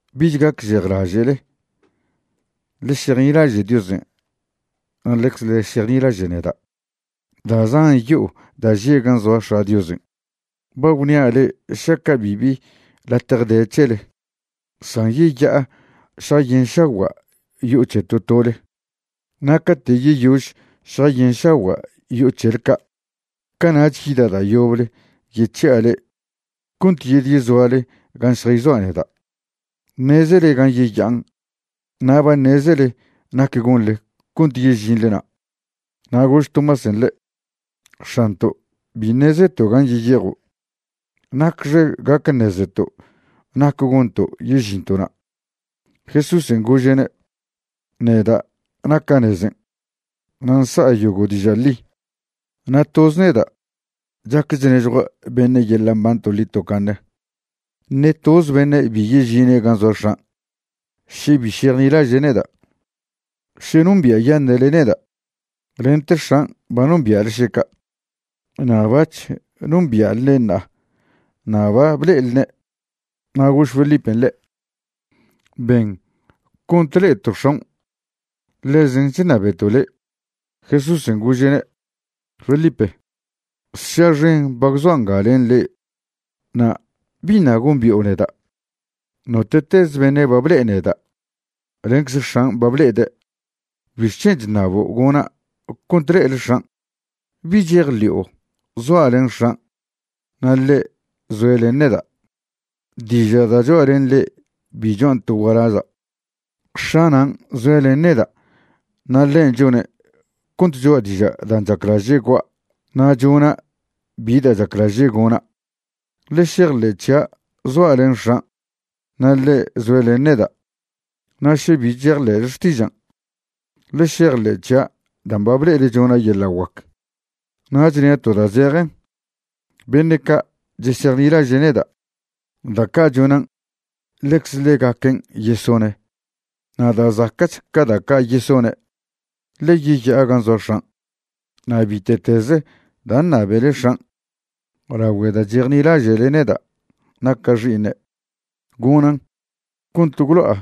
’Bich gacžejlaže'le. Ḻe šejnilaže' Diosen' na' ḻecze ḻe šejnilaže' neda'. Da' zan yo'o da' že' gan' zoa X̱a' Diosen'. Ba gwnia' le'e šaca' bibi latje de c̱hele, san yeya'a šjayenšagua' yo'o c̱he to tole. Na' cate' yeyož šjayenšagua' yo'o c̱hele ca', cana'ch yida' da' yoble yec̱hi'a le'e cont yedyezoale gan' šjayzoa' neda'. Ṉezele gan' yeya'an' na' ba ṉezele nac gonḻe cont yežinḻe na'. Na' gož Tomásen' ḻe': ―X̱anto', bi ṉezeto' gan' yeyejo'. ¿Nacxe gac ṉezeto' nac gonto' yežinto' na'? Jesúsen' gože'ne': ―Neda' naca' nezen' na' nsa'a yogo' diža' ḻi, na' toz neda' chac chnežjua' beṉe' yeḻa' mban toḻi tocaṉe. Ṉe toze beṉe' bi yežine' gan' zoa X̱an' še bi šejnilaže' neda'. Še nombia'yaṉe'le neda', lente X̱an' ba nombia'le še ca'. Na' bac̱h nombia'lne' ṉa'a na' ba ble'elne'. Na' gož Felipen' ḻe': ―Ben cont le'eto' X̱aon', ḻezen' chṉabeto' le'. Jesúsen' gože'ne': ―Felipe, sša xen ba gwzoa' nga len le'e na' ¿biṉa' gombi'o neda'? Note'tez beṉe' ba ble'e neda' ḻencze X̱an' ba ble'ede'. ¿Bixc̱hen' chṉabo' gona' cont le'ele X̱an'? ¿Bi chejḻi'o zoa' len X̱an' na' ḻe' zoe' len neda'? Diža' da' choa' len le'e bi choan' to gualaza'. X̱a' nan' zoe' len neda' na' ḻen' chone' cont choa' dižan' chaclaže' gua' na' chona' bi da' chaclaže' gona'. Ḻe šejḻe' c̱hia' zoa' len X̱an' na' ḻe' zoe' len neda'. Na' še bi chejḻe'le xtižan', ḻe šejḻe' c̱hia' dan' ba ble'ele chona' yeḻa' guac. Na' chnia' to da' zejen, beṉe' ca' chesejnilaže' neda', da' ca' chonan' ḻecze ḻegaquen yesone'. Na' da' zaca'ch ca da' ca' yesone', ḻe yeya'a gan' zoa X̱an'. Na' bite'teze da' ṉabele X̱an' lagüe da' chejnilaže'le neda' naca' Xi'iṉe', gonan', cont gwlo'a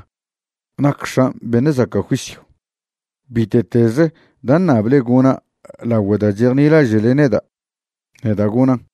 nac X̱an' beṉe' zaca' juisyw. Bite'tez da' ṉable gona' lagüe da' chejnilaže'le neda', neda' gonan'.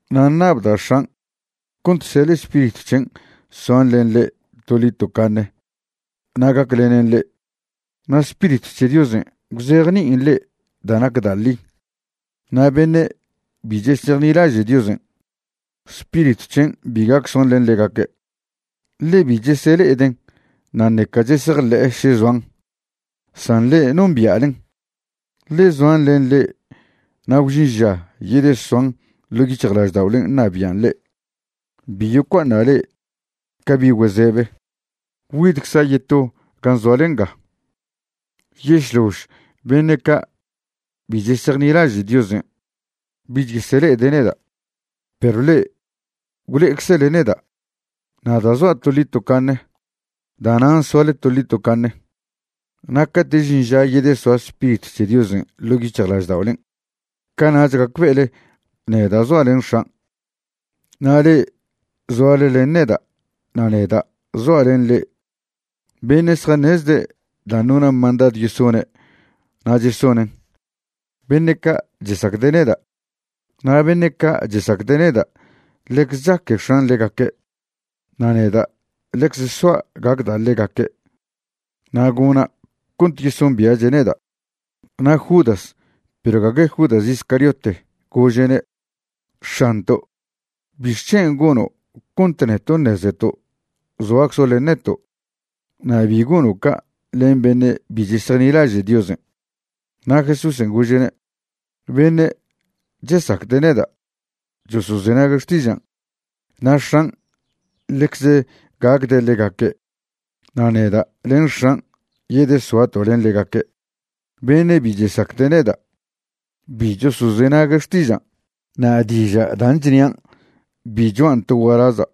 Na' ṉabda' X̱an' cont seḻe' Spiritw c̱hen' soan len le'e toḻi tocaṉe na' gaclenen le'e. Na' Spiritw c̱he Diosen' gwzejni'in le'e da' nac da' ḻi. Na' beṉe' bi chesejnilaže' Diosen', Spiritw c̱hen' bi gac soan len ḻegaque', ḻe bi chesele'eden' na' ṉeca chesejḻe'e še zoan. San le'e nombia'len, ḻe zoan len le'e na' gwžin ža yedesoan ḻo' yic̱hjlažda'olen' ṉabian' le'e. Bi yocua'aṉa' le'e ca bi' güezebe. Güidcza' yeto gan' zoale nga. Yešlož beṉe' ca' bi chesejnilaže' Diosen' bich yesele'ede' neda', perw le'e gwle'eczele neda'. Na' da' zoa' toḻi tocaṉe, da'nan' soale toḻi tocaṉe. Na' cate' žin ža yedesoa Spiritw c̱he Diosen' ḻo' yic̱hjlažda'olen', cana'ch gacbe'ele neda' zoa' len X̱an' na' le'e zoale len neda' na' neda' zoa' len le'e. Beṉe' zjaṉezde' dan' nona' mandadw yesone' na' chesonen', beṉe' ca' chesacde' neda'. Na' beṉe' ca' chesacde' neda' ḻecze chaque X̱an' ḻegaque', na' neda' ḻecze soa' gacda' ḻegaque' na' gona' cont yesombia'che' neda'. Na' Judas (perw gague Judas Iscariote) gože'ne': ―X̱anto', ¿bixc̱hen' gono' cont neto' ṉezeto' zoaczo' len neto' na' bi gono' ca' len beṉe' bi chesejnilaže' Diosen'? Na' Jesúsen' gože'ne': ―Beṉe' chesacde' neda' chosozenague' xtižan', na' X̱an' ḻecze gacde' ḻegaque' na' neda' len x̱an' yedesoato' len ḻegaque'. Beṉe' bi chesacde' neda' bi chosozenague' xtižan'. Na' diža' dan' chnian' bi cho'an to gualaza'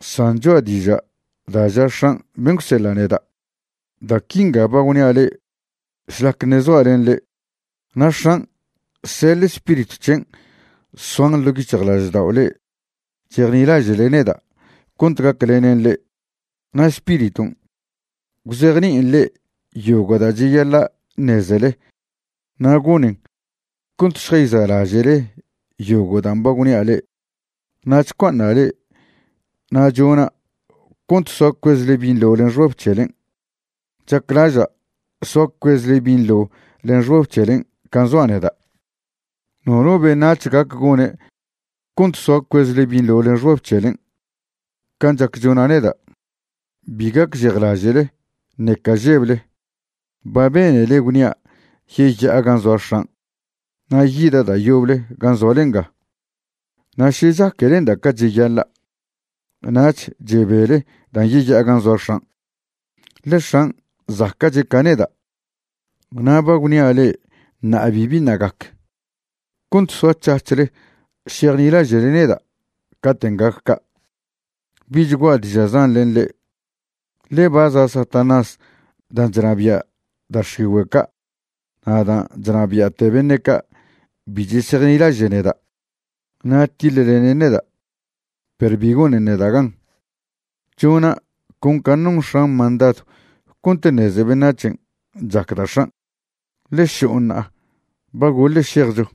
san cho'a diža' da' ža X̱an' ben' gwseḻa' neda'. ’Da' quinga ba gwnia' le'e šlac ṉe' zoa' len le'e. Na' X̱an' seḻe' Spiritw c̱hen' soan ḻo' yic̱hjlaždao' le'e chejnilaže'le neda' cont gaclenen le'e. Na' Spiriton' gwzejni'in le'e yogo' da' cheyaḻa' ṉezele na' gonen cont šjayza'laže'le yogo' dan' ba gwnia' le'e. ’Na' chcua'aṉa' le'e na' chona' cont soa cuezle binḻo len xbab c̱helen'. Chaclaža' soa cuezle binḻo len xbab c̱helen' can' zoa' neda'. Nono beṉac̱h gac gone' cont soa cuezle binḻo len xbab c̱helen' can' chac chona' neda'. Bi gacžejlaže'le, ṉeca žeble. Ba benele gwnia' yeya'a gan' zoa X̱an' na' yida' da' yoble gan' zoale nga. Na' ša chaquelenda' ca cheyaḻa', nach chebele dan' yeya'a gan' zoa X̱an', ḻe X̱an' zaca'che' ca neda'. Na' ba gwnia' le'e ṉa'a bibi ṉa' gac, cont soac̱hac̱hle šejnilaže'le neda' caten' gac ca'. ’Bich gua'a diža' zan len le'e, ḻe ba za' Satanás dan' chnabia' da' x̱igüe' ca' na' dan' chnabia'te beṉe' ca' bi chesejnilaže' neda', na' tiḻlenen neda', perw bi gonen neda' gan. Chona' con can' non X̱an' mandadw cont ṉeze beṉac̱hen' chacda' X̱an'. Ḻe šo'o ṉa'a, ba goḻe šejcho.